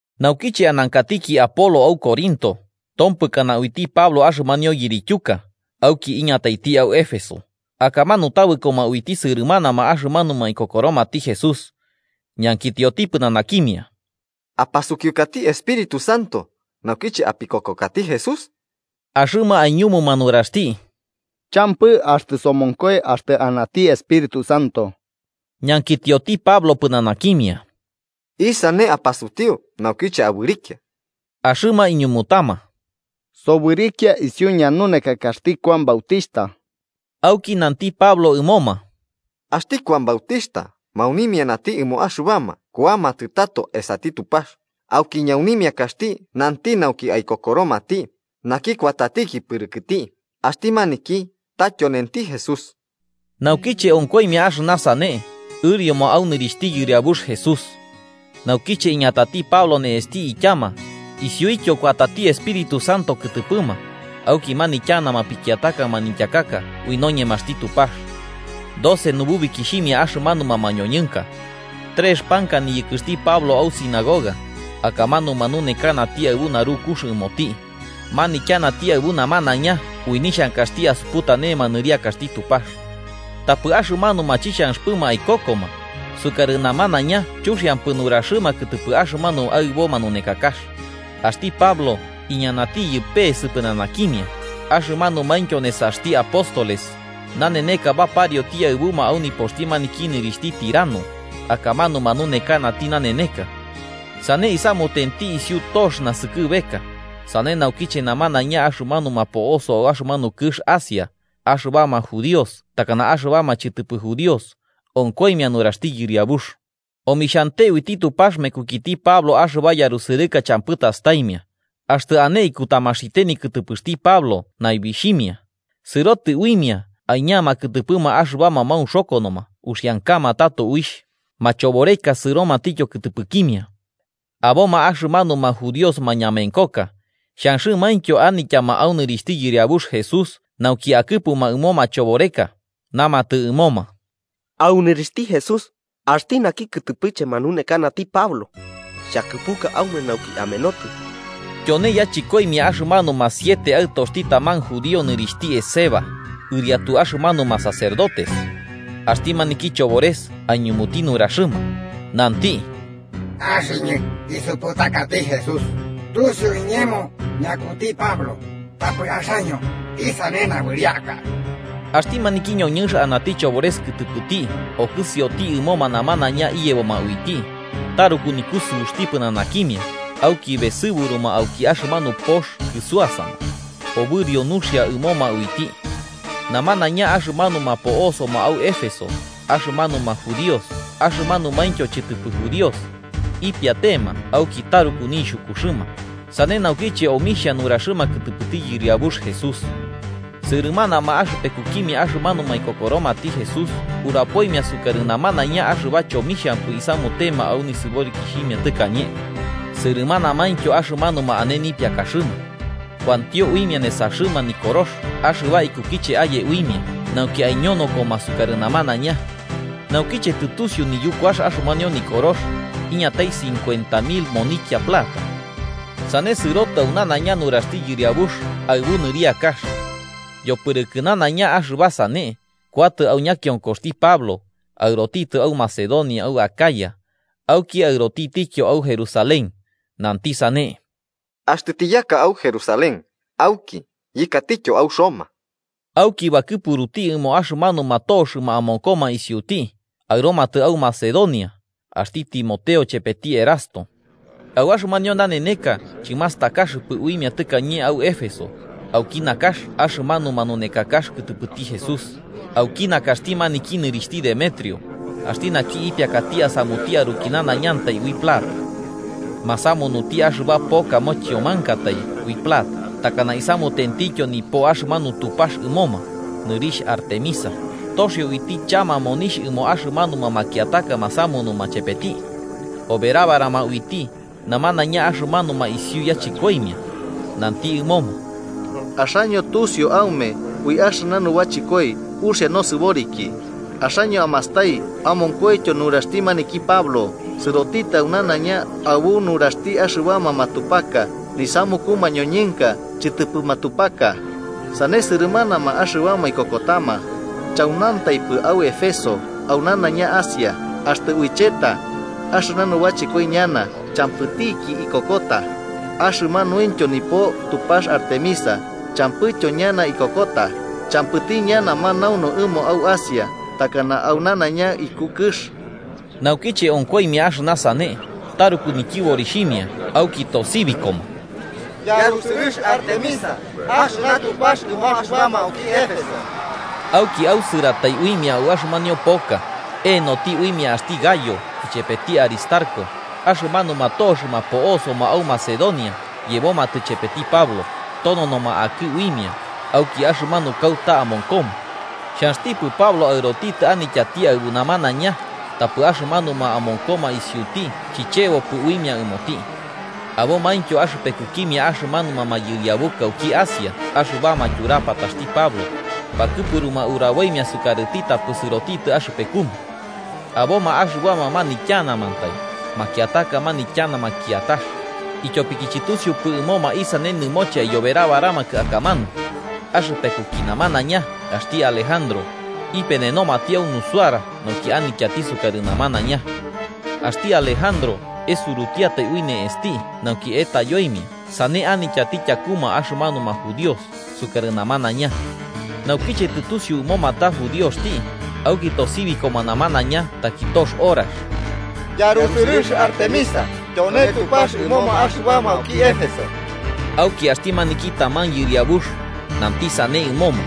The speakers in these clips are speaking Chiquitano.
Naukiche anankatiki Apolo au Corinto, tompɨkana uiti Pablo axɨmanio yirityuka, auki iñataiti au Éfeso, akamanu tabɨkoma uiti sɨrɨmanama axɨmanuma ikokoromati Jesús. Ñankitioti pɨnanakimia: –¿Apasukiukati Espíritu Santo naukiche apikokokati Jesús? Axɨma aiñumuma nuraxti: –Champɨ, axtɨ somonkoi axtɨ anati Espíritu Santo. Ñankitioti Pablo pɨnanakimia: –¿Isane apasutiu naukiche abɨrikia? Axɨma iñumutama: –Sobɨrikia isiu ñanunekakaxti Kuan Bautixhta. Auki nanti Pablo ɨmoma: –Axti Kuan Bautixhta maunimianati ɨmo axɨbama kuamatɨ tato esati Tupax, auki ñaunimiakaxti nanti nauki aikokoromati naki kuatatiki pɨrɨkɨti, axti maniki ta, tyonenti Jesús. Naukiche onkoimia axɨna sane, ɨrioma au nɨrixhti Yɨriabux Jesús. Naukiche iñatati Pablo ne'esti ityama, isiuityo kuatati Espíritu Santo kɨtɨpɨma, auki manityanama pikiataka manityakaka ui npñemaxti Tupax. Doce nububikixhimia axɨmanuma mañoñɨnka. Trex panka niyɨkɨxti Pablo au sinagoga, akamanu manunekanati aɨbu narukux ɨmoti, manityanati aɨbu namanaiña ui nixhankaxti asuputanema nɨriakaxti Tupax. Tapɨ axɨmanuma chixhanxɨpɨma aikokoma, sukarɨ namanaiña chuxiampɨ nuraxɨma kɨtɨpɨ axɨmanu aɨbo manunekakax, axti Pablo, iñanatiyɨ peese pɨnanakimia, axɨmanumaintyo nesaxti apóstoles, naneneka baparioti aɨbuma au nipoxti maniki nɨrixhti Tirano, akamanu manunekanati naneneka. Sane isamutenti isiu tox naskɨbeka, sane naukiche namanaiña axɨmanuma po'osoma au axɨmanu kɨx Asia, axɨbama judíos takana axɨbama chɨtɨpɨ judíos, onkoimia nuraxti Yɨriabux. Omixhante uiti Tupax mekukiti Pablo axɨba yarusɨrɨka champɨ tastaimia, axtɨ ane ikutamaxite nikɨtɨpɨxti Pablo naibixhimia, sɨrotɨ uimia aiñama kɨtɨpɨma axɨbama maunxokonoma uxiankama tato uixh, machoboreka sɨromatityo kɨtɨpɨkimia. Aboma axɨmanuma judíos mañamenkoka, xhanxɨmaintyo anityama au nɨrixhti Yɨriabux Jesús nauki akɨpuma ɨmo machoboreka, namatɨ ɨmoma: “¡Au nɨrixhti Jesús, axti naki kɨtɨpɨche manunekanati Pablo, xhakɨpuka aume nauki amenotɨ!” Tyone yachɨkoimia axɨmanuma siete aɨtoxti taman judío nɨrixhti Esceva, ɨriatu axɨmanuma sacerdotes. Axti maniki chobores aiñumuti nuraxɨma, nanti: “Axɨñɨ isuputakati Jesús, tusiu iñemo ñakuti Pablo. Tapɨ axaño, ¿isane nabɨriaka?” Axti maniki ñoñɨnx anati chobores kɨtɨpɨti okɨsioti ɨmoma namanaiña iyeboma uiti, taruku nikusɨuxti pɨnanakimia auki besɨburuma auki axɨmanu pox kɨsuasama, obɨrio nuxia ɨmoma uiti. Namanaiña axɨmanuma po'osoma au Éfeso, axɨmanuma judíos axɨmanumaintyo chɨtɨpɨ judíos, ipiatema auki taruku nixhukuxɨma, sane naukiche omixhia nuraxɨma kɨtɨpɨti Yɨriabux Jesús. Sɨrɨmanama axɨpekukimia axɨmanuma ikokoromati Jesús urapoimia sukarɨ namanaiña axɨba chomixhampɨ isamutema au nisɨborikixhimia tɨkañe, sɨrɨmanamaintyo axɨmanuma ane nipiakaxɨma, kuantio uimia nesaxɨma nikorox axɨba ikukiche aye uimia, nauki aiñonokoma sukarɨ namanaiña. Naukiche tɨtusiu niyukuax axɨmanio nikorox, iñatai cincuenta mil monikia plata. Sane sɨrotɨ au nanaiña nuraxti Yɨriabux aɨbu nɨriakax. Yopɨrɨkɨ nanaiña axɨba sane, kuatɨ au ñakionkoxti Pablo, aɨrotitɨ au Macedonia au Acaya, auki aɨrotitityo au Jerusalén, nanti sane: –Axtɨ tiyaka au Jerusalén auki yɨkatityo au Roma. Auki bakɨpuruti ɨmo axɨmanuma toxɨma amonkoma isiuti, aɨromatɨ au Macedonia, axti Timoteo chepeti Erasto. Au axɨmanio naneneka chɨmastakaxɨpɨ uimia tɨkañe au Éfeso, auki nakax axɨmanu manunekakax kɨtɨpɨti Jesús, auki nakaxti maniki nɨrixhti Demetrio, axti naki ipiakati asamuti aruki nanaiñantai ui plata. Masamunuti axɨba poka mochiomankatai ui plata takana isamutentityo nipo axɨmanu Tupax ɨmoma, nɨrixh Artemisa, toxio uiti chama monixh ɨmo axɨmanuma makiataka masamunuma chepeti. Oberabarama uiti, namanaiña axɨmanuma isiu yachɨkoimia, nanti ɨmoma: “Axaño tusiu aume ui axɨna nubachɨkoi uxia nosɨboriki. Axaño amastai amonkoityo nuraxti maniki Pablo, sɨrotitɨ au nanaiña aɨbu nuraxti axɨbama matupaka nisamuku mañoñɨnka chɨtɨpɨ matupaka. Sane sɨrɨmanama axɨbama ikokotama, chaunantaipɨ au Éfeso, au nanaiña Asia. Axtɨ uicheta, axɨna nubachɨkoi ñana champɨtiki ikokota, axɨmanuintyo nipo Tupax Artemisa champɨtityo ñana ikokota, champɨti ñana manaunu ɨmo au Asia takana au nanaiña iku kɨx.” Naukiche onkoimia axɨna sane, taruku nityɨborixhimia auki tosibikoma: “¡Yarusɨrɨx Artemisa axɨna Tupax ɨmo axɨbama auki Éfeso!” Auki ausɨratai uimia au axɨmanio poka, e'enoti uimia axti Gayo ichepeti Aristarco, axɨmanuma toxɨma po'osoma au Macedonia yebomatɨ chepeti Pablo, tononoma akɨ uimia, auki axɨmanu kauta amonkoma. Xhanxtipɨ Pablo aɨrotitɨ anityati aɨbu namanaiña, tapɨ axɨmanuma amonkoma isiuti chichebopɨ uimia ɨmoti. Abomaintyo axɨpekukimia axɨmanuma mayɨriabuka auki Asia axɨbama tyurapataxti Pablo, bakɨpuruma uraboimia sukarɨti tapɨ sɨrotitɨ axɨpekuma. Aboma axɨbama manityanamantai, makiataka nanityanama kiatax, ityopiki chɨtusiupɨ ɨmoma isane nɨmoche aiyoberabaramakɨ akamanu. Axɨpekuki namanaiña axti Alejandro, ipenenomati au nusuara nauki anityati sukarɨ namanaiña. Axti Alejandro esurutiatai ui ne'esti nauki etayoimia sane anityati tyakuma axɨmanuma judíos sukarɨ namanaiña. Naukiche tɨtusiu ɨmoma ta judioxti, auki tosibikoma namanaiña taki tox horax: “¡Yarusɨrɨx Artemisa tyone Tupax ɨmoma axɨbama auki Éfeso!” Auki axti maniki taman yɨriabux, nanti sane ɨmoma: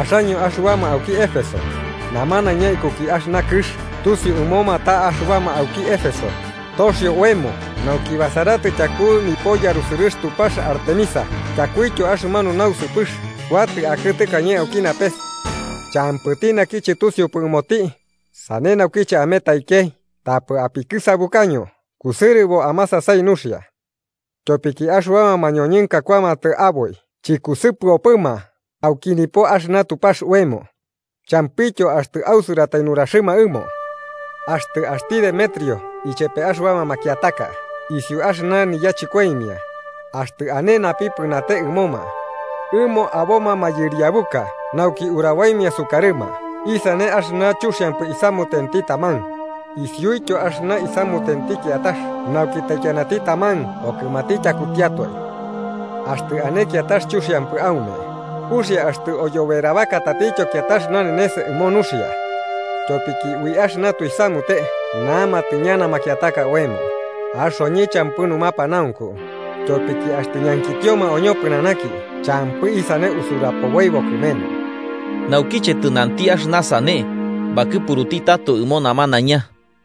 “Axaño axɨbama auki Éfeso, namanaiña ikuki axɨna kɨx tusiu ɨmoma ta axɨbama auki Éfeso, toxio oemo nauki basaratɨ tyaku nipo yarusɨrɨx Tupax Artemisa tyakuityo axɨmanu nausɨpɨx kuatɨ akɨ tɨkañe auki napes. Champɨti naki chɨtusiupɨ ɨmoti, sane naukiche ametaikei tapɨ apikɨsabukaño, kusɨrɨbo amasasai nuxia. Tyopiki axɨbama mañoñɨnka kuamatɨ aboi chɨkusɨpɨopɨma auki nipo axɨna tupax oemo, champɨityo axtɨ ausɨratai nuraxɨma ɨmo. Axtɨ axti Demetrio ichepe axɨbama makiataka isiu axɨna niyachɨkoimia, axtɨ ane napipɨnate ɨmoma, ɨmo aboma mayɨriabuka nauki uraboimia sukarɨma isane axɨna chuxiampɨ isamutenti taman, isiuityo axɨna isamutenti kiatax nauki taikianati taman okɨmati tyakutiatoe. Axtɨ ane kiatax chuxiampɨ aume, uxia axtɨ oyoberabaka tatityo kiatax nanenes ɨmo nuxia. Tyopiki ui axɨna tuisamute namatɨ ñana makiataka oemo, axoñɨ champɨ numapanaunku, tyopiki axtɨ ñankitioma oñopɨnanaki champɨ isane usurapoboibo kɨmenu.” Naukiche tɨnanti axɨna sane bakɨpuruti tato ɨmo namanaiña.